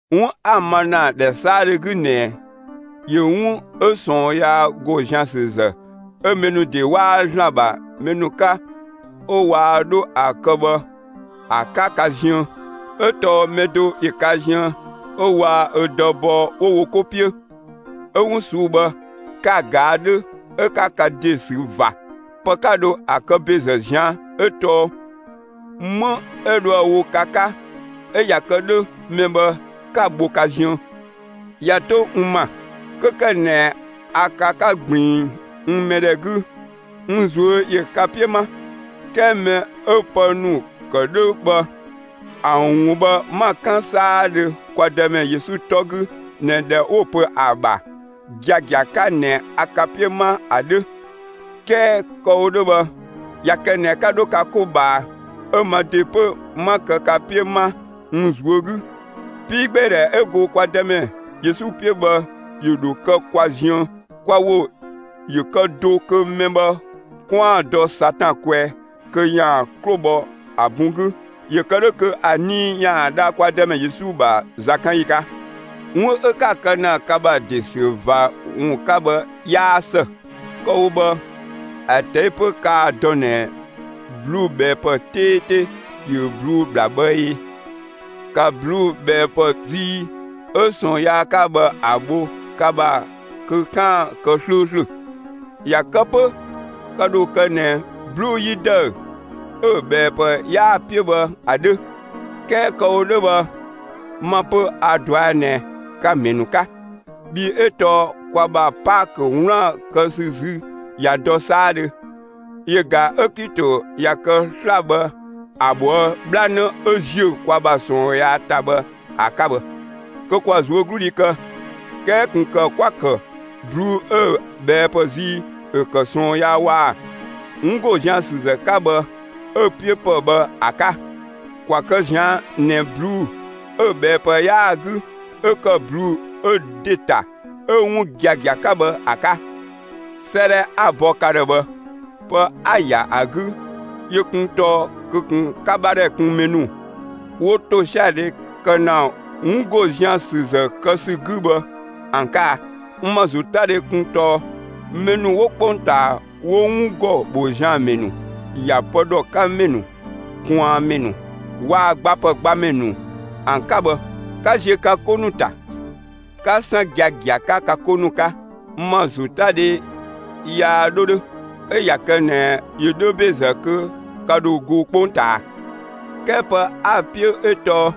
'Wun 'a‑ ma ‑na ‑dhɛ 'saadhö 'gü ꞊nɛ, ‑yö 'wun 'ö ꞊sɔɔn yaa ‑go zian ‑sü ‑zë 'ö mɛ ‑nu ‑de 'waa ‑Zlan ‑bha mɛ ‑nu 'ka 'ö waa 'dho ‑a ka bhë ‑a 'ka ka ziën. 'Ö tɔɔ mɛ do ‑yö ka ziën 'ö waa‑ ö dë bɔɔ 'wo wo 'ko 'piö. 'Ö 'wun ꞊suu'‑ bhë, 'ka‑ ꞊gaa' 'dhö 'ö 'ka ka ‑de sü ꞊va. Pë 'ka dho ‑a kë ‑bezë ꞊zian' 'ö tɔɔ 'më 'ö dhoë‑ wo ka 'ka 'ö ꞊ya kë 'dhö mɛ bhë 'ka‑ bho ka ziën. ꞊Ya 'to n ‑ma, 'kö ‑kë ꞊nɛ a ka 'ka ꞊gbiin n mɛdhɛ 'gü, n ꞊zuö' ‑yö ka 'piö 'ma. 'Kɛɛ mɛ 'ö pë ‑nu ‑kë 'dhö bhë, ‑a ‑wun bhë 'ma‑ 'kan 'saadhö kwa Dëmɛ Yesu 'tɔ 'gü ꞊nɛ ꞊dhɛ 'wo‑ pö ‑a ‑bha giagia 'ka ꞊nɛ a ka 'piö 'ma ‑a 'dhö; 'kɛɛ kë‑ wo 'dhö bhë ꞊ya kë ꞊nɛ 'ka 'dho ka 'ko ꞊bhaa 'ö ma ‑de 'pö 'ma kë ka 'piö 'ma n ꞊zuö' 'gü, 'piigbeedhɛ 'ö go kwa Dëmɛ Yesu 'piö bhë ‑yö ‑dho kë kwa ziën. Kwa ‑wo ‑yö kë do kö mɛ bhë 'kwaan‑ dɔ Satan kwɛɛ kö ‑yaan 'klo bhɔ ‑a bun 'gü, ‑yö kë 'dhö kö ‑a nii ‑yaan dha kwa Dëmɛ Yesu ‑bha zakanyi 'ka. 'Wun 'ö 'ka‑ kë ‑na ka ‑bha ‑de ‑sü ꞊va ‑wun 'ka bhë 'yaa ‑së. Kë‑ wo bhë ‑a ꞊tɛi' 'pö kaa‑ dɔ ꞊nɛ ꞊bluubhɛɛpë 'teete ‑yö 'bluu‑ ‑bhla bhë ꞊ee? ‑Ka ꞊bluubhɛɛpë zii 'ö ꞊sɔɔn yaa 'ka bhë ‑a bho ka ‑bha kö 'kaan‑ kë 'slööslö! ꞊Ya kë 'pö ka ‑dho kë ꞊nɛ 'bluu‑ 'yi ‑dëü 'ö‑ ꞊bhɛɛpë 'yaa‑ 'piö bhë ‑a 'dhö. 'Kɛɛ kë‑ wo 'dhö bhë, ma 'pö a‑ ꞊dɔa' ꞊nɛ ka‑ ‑mɛ ‑nu 'ka. Bhii 'ö tɔɔ kwa ‑bha Paakö 'wlaan‑ kë ‑sü zü ꞊ya dɔ 'saadhö; yö ꞊ga 'ö Klito ꞊ya kë sla‑ bhë ‑a ꞊bhoë' 'bhlanë 'ö ‑ziö kwa ‑bha ꞊sɔɔn yaa ‑ta bhë ‑a 'ka bhë. Kö ‑kwa ꞊zuögludhi kë; 'kɛɛ ꞊kun ‑kë 'kwa‑ ‑kë ꞊bluu'‑ 'ö‑ ꞊bhɛɛpë zii 'ö ‑kë ꞊sɔɔn yaa waa‑ 'wun ‑go zian‑ ‑sü ‑zë 'ka bhë 'ö‑ 'piö bhë ‑a 'ka. ‑Kwa kë ꞊zian' ꞊nɛ ꞊bluu'‑ 'ö‑ ꞊bhɛɛpë 'yaa‑ 'gü 'ö ‑kë ꞊bluu'‑ 'ö ‑de ‑ta, 'ö 'wun giagia 'ka bhë ‑a 'ka. 'Sëëdhɛ 'a‑ bɔ ka ‑dhë bhë, pë 'a ‑ya ‑a 'gü yö kun tɔɔ kö ꞊kun 'ka 'bhadhɛ kun mɛ ‑nu 'wo ‑tosiadhe kë ‑na 'wun ‑go zian‑ ‑sü ‑zë kë ‑sü 'gü bhë ‑an 'ka a? N ‑ma ‑zotadhe kun tɔɔ mɛ ‑nu 'wo 'kpongtaa, 'wo 'wun ‑gɔ ‑bho zian‑ ‑mɛ ‑nu, ‑ya pë ‑dhɔ 'ka ‑mɛ ‑nu, ꞊kwaanmɛ ‑nu, waa‑ gbapë gbamɛ ‑nu ‑an 'ka bhë, 'ka ziö ka 'ko ‑nu ‑ta, 'ka 'san giagia 'ka ka 'ko ‑nu 'ka. N ‑ma ‑zotadhe yaa 'dho 'dhö. 'Ö ꞊ya kë ꞊nɛ ‑yö 'dhö ‑bezë kö ka ‑dho go 'kpongtaa. 'Kɛɛ pë 'a‑ 'piö 'ö tɔɔ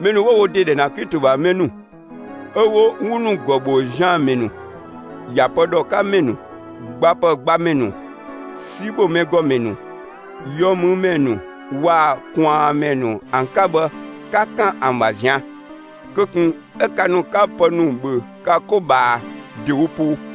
mɛ ‑nu 'wo wo ‑de ‑dhɛ ‑na Klito ‑bha mɛ ‑nu 'ö 'wo 'wun ‑nu ‑gɔ ‑bho zian‑ ‑mɛ ‑nu, ‑ya pë ‑dhɔ 'ka ‑mɛ ‑nu, gbapë gbamɛ ‑nu, 'si ‑bho mɛ ‑gɔ ‑mɛ ‑nu, yɔmümɛ ‑nu waa‑ ꞊kwaanmɛ ‑nu ‑an 'ka bhë, 'ka 'kan ‑an ‑bha ꞊zian'! Kö ꞊kun 'ö ka ‑nu 'ka pë ‑nu ‑bhö ka 'ko ꞊bhaa ‑dewo poo.